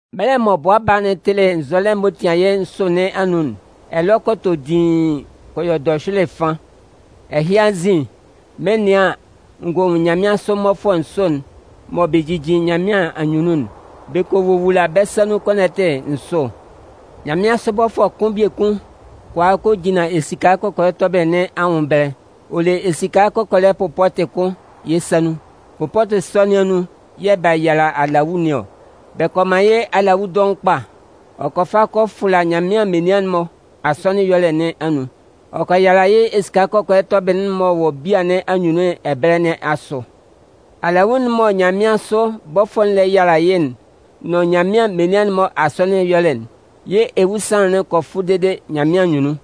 Mɛlɛ mɔ Bʋa Baa'n tɩlɩ nzɔlɛ'n m'ɔ tian yɩ́ nsʋ nɩn anun'n, ɛlɔ kɔ tɔ diin kɔ yɔ dɔhyʋɩlɩ fan. Ɛhɩ anzin, mɩn 'nɩan an, n gɔ nwun nyanmɩansʋ mmɔfʋɛ nsʋ'n mɔ bɛ jijin Nyanmɩan anyunnun'n. Bɛ kɔ wowula bɛ́ sa nun kɔnɔtɩ nsʋ. Nyanmɩansʋ bɔfʋɛ kʋn biekun kɔ a kɔ jinlan esika kɔkɔlɛ tɔbɩlɩ nɩn anwʋn ɛbɛlɛ. Ɔ le esika kɔkɔlɛ pʋpɔtɩ kʋn yɩ́ sa nun. Pʋpɔtɩ sɔ nɩn anun yɛ̂ bɛ yala alawu nɩn ɔ. Bɛ kɔ man yɩ́ alawu dɔʋn kpa. Ɔ kɔ fa kɔ fʋla Nyanmɩan menian'n-mɔ asɔnɩn ɛyɔlɛ nɩn anun. Ɔ kɔ yala yɩ́ esika kɔkɔlɛ tɔbɩlɩ'n m'ɔ wɔ bia nɩn anyunnun ɛbɛlɛ nɩn asʋ. Alawu'n mɔ nyanmɩansʋ bɔfʋɛ'n lɛ yala yɩ́ nʋn Nyanmɩan menian'n-mɔ asɔnɩn ɛyɔlɛ'n, yɩ́ ewusanlan'n kɔ fʋ dede Nyanmɩan anyunnun.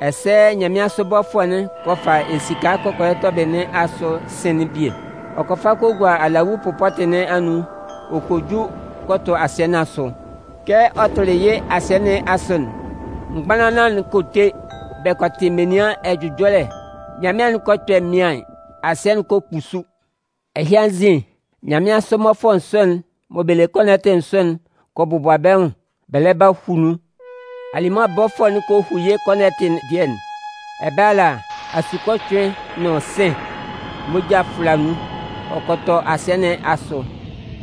Ɛsɛ nyanmɩansʋ bɔfʋɛ'n kɔ fa esika kɔkɔlɛ tɔbɩlɩ nɩn asʋ sɩ̂n'n bie. Ɔ kɔ fa kɔ gua alawu pʋpɔtɩ nɩn anun ɔ kɔ ju kɔ tʋ asɩɛ nɩn asʋ. Kɛ ɔ tʋlɩ yɩ́ asɩɛ nɩn asʋ'n, mgbanlanlan'n kɔ te, bɛ kɔ tɩ menian ɛjʋjɔlɛ, nyanmɩan'n kɔ kpɛ mɩaɩn, asɩɛ'n kɔ kpusu. Ɛhɩ anzin, nyanmɩansʋ mmɔfʋɛ nsʋ'n mɔ bɛ le kɔnɔtɩ nsʋ'n kɔ bɔbʋa bɛ́ nwʋn bɛ lɛ ba hu nun. Alimʋa bɔfʋɛ'n kɔ hu yɩ́ kɔnɔtɩ dɩɛ'n. Ɛbɛlɛ ala, asukocʋɩn nʋn sɩ̂n, moja fʋla nun, ɔ kɔ tɔ asɩɛ nɩn asʋ.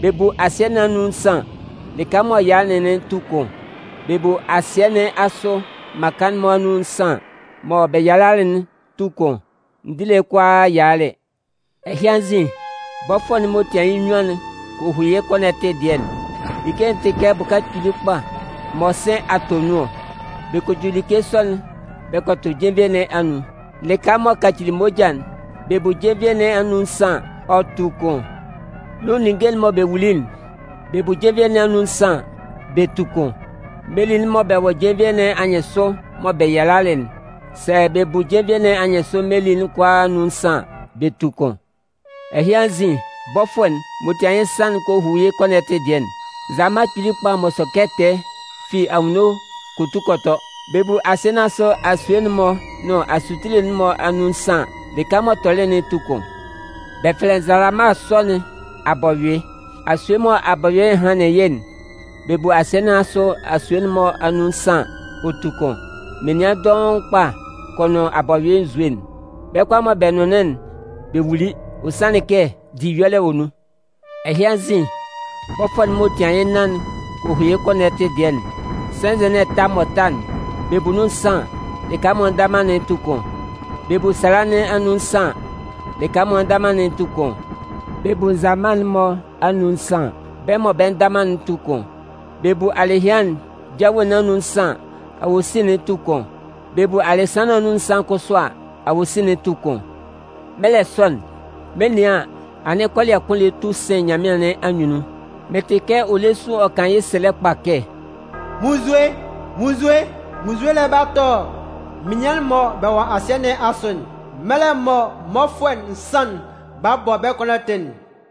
Bɛ bu asɩ nɩn anun nsan an, lɩka m'ɔ yalalɩ'n tu kʋn. Bɛ bu asɩɛ nɩn asʋ mmaka'n-mɔ anun nsan an, mɔ bɛ yalalɩ'n tu kʋn. Ndile kʋalaa yalalɩ. Ɛhɩ anzin, bɔfʋɛ'n m'ɔ tian yɩ́ nnyuan'n kɔ hu yɩ́ kɔnɔtɩ dɩɛ'n. Like'n tɩ kɛ bʋka kpili kpa mɔ sɩ̂n a tɔ nun ɔ. Bɛ kɔ ju like sɔ'n bɛ kɔ tʋ jenvie nɩn anun. Lɩka m'ɔ kacili moja'n, bɛ bu jenvie nɩn anun nsan an, ɔ tu kʋn. Nun ninnge'n mɔ bɛ wuli'n, bɛ bu jenvie nɩn anun nsan an, bɛ tu kʋn. Meli'n mɔ bɛ wɔ jenvie nɩn anyɩnsʋ mɔ bɛ yalalɩ'n, sɛ bɛ bu jenvie nɩn anyɩnsʋ meli'n kʋalaa anun nsan an, bɛ tu kʋn. Ɛhɩ anzin, bɔfʋɛ'n m'ɔ tian yɩ́ nsan'n kɔ hu yɩ́ kɔnɔtɩ dɩɛ'n. Nzalama kpili kpa m'ɔ sɔ kɛ tɛɛ, ɔ fi anwunno kɔ tu kɔ tɔ. Bɛ bu asɩɛ nɩn asʋ asue'n-mɔ nʋn asutile'n-mɔ anun nsan an, lɩka m'ɔ tɔlɩ'n tu kʋn. Bɛ fɛlɛ nzalama sɔ nɩn “Abɔyʋɩ”. Asue mɔ Abɔyʋɩ'n hanlɩn yɩ́'n, bɛ bu asɩɛ nɩn asʋ asue'n-mɔ anun nsan an, ɔ tu kʋn. Menian dʋɔn kpa kɔ nʋn Abɔyʋɩ nzue'n. Bɛ́ kʋalaa mɔ bɛ nʋnlɩn'n, bɛ wuli. Ɔ sanlɩn kɛ diyɔlɛ wɔ nun. Ɛhɩ anzin, bɔfʋɛ'n m'ɔ tian yɩ́ nnan'n kɔ hu yɩ́ kɔnɔtɩ dɩɛ'n. Sɛnzɛ nɩn ɛta m'ɔ ta'n, bɛ bu nun nsan an, lɩka m'ɔ nda man'n tu kʋn. Bɛ bu sala nɩn anun nsan an, lɩka m'ɔ nda man'n tu kʋn. Bɛ bu nzalama'n-mɔ anun nsan an, bɛ́ mɔ bɛ nda man'n tu kʋn. Bɛ bu alɩhɩan'n jawe nɩn anun nsan an, awosin'n tu kʋn. Bɛ bu alɩsan nɩn anun nsan kʋsʋ a, awosin'n tu kʋn. Mɛlɛ sɔ'n, mɩn 'nɩan an, anɩn kɔlɩɛ kʋn lɛ tu sɩn nyanmɩan nɩn anyunnun. Mɩn tɩ kɛ ɔ lɛ sun ɔ kan yɩ́ sɛlɛ kpa kɛ: “Munnzue! Munnzue! Munnzue lɛ ba tʋ menian'n-mɔ mɔ bɛ wɔ asɩɛ nɩn asʋ'n mɛlɛ mɔ mmɔfʋɛ nsan'n 'ba hu bɛ́ kɔnɔtɩ'n!”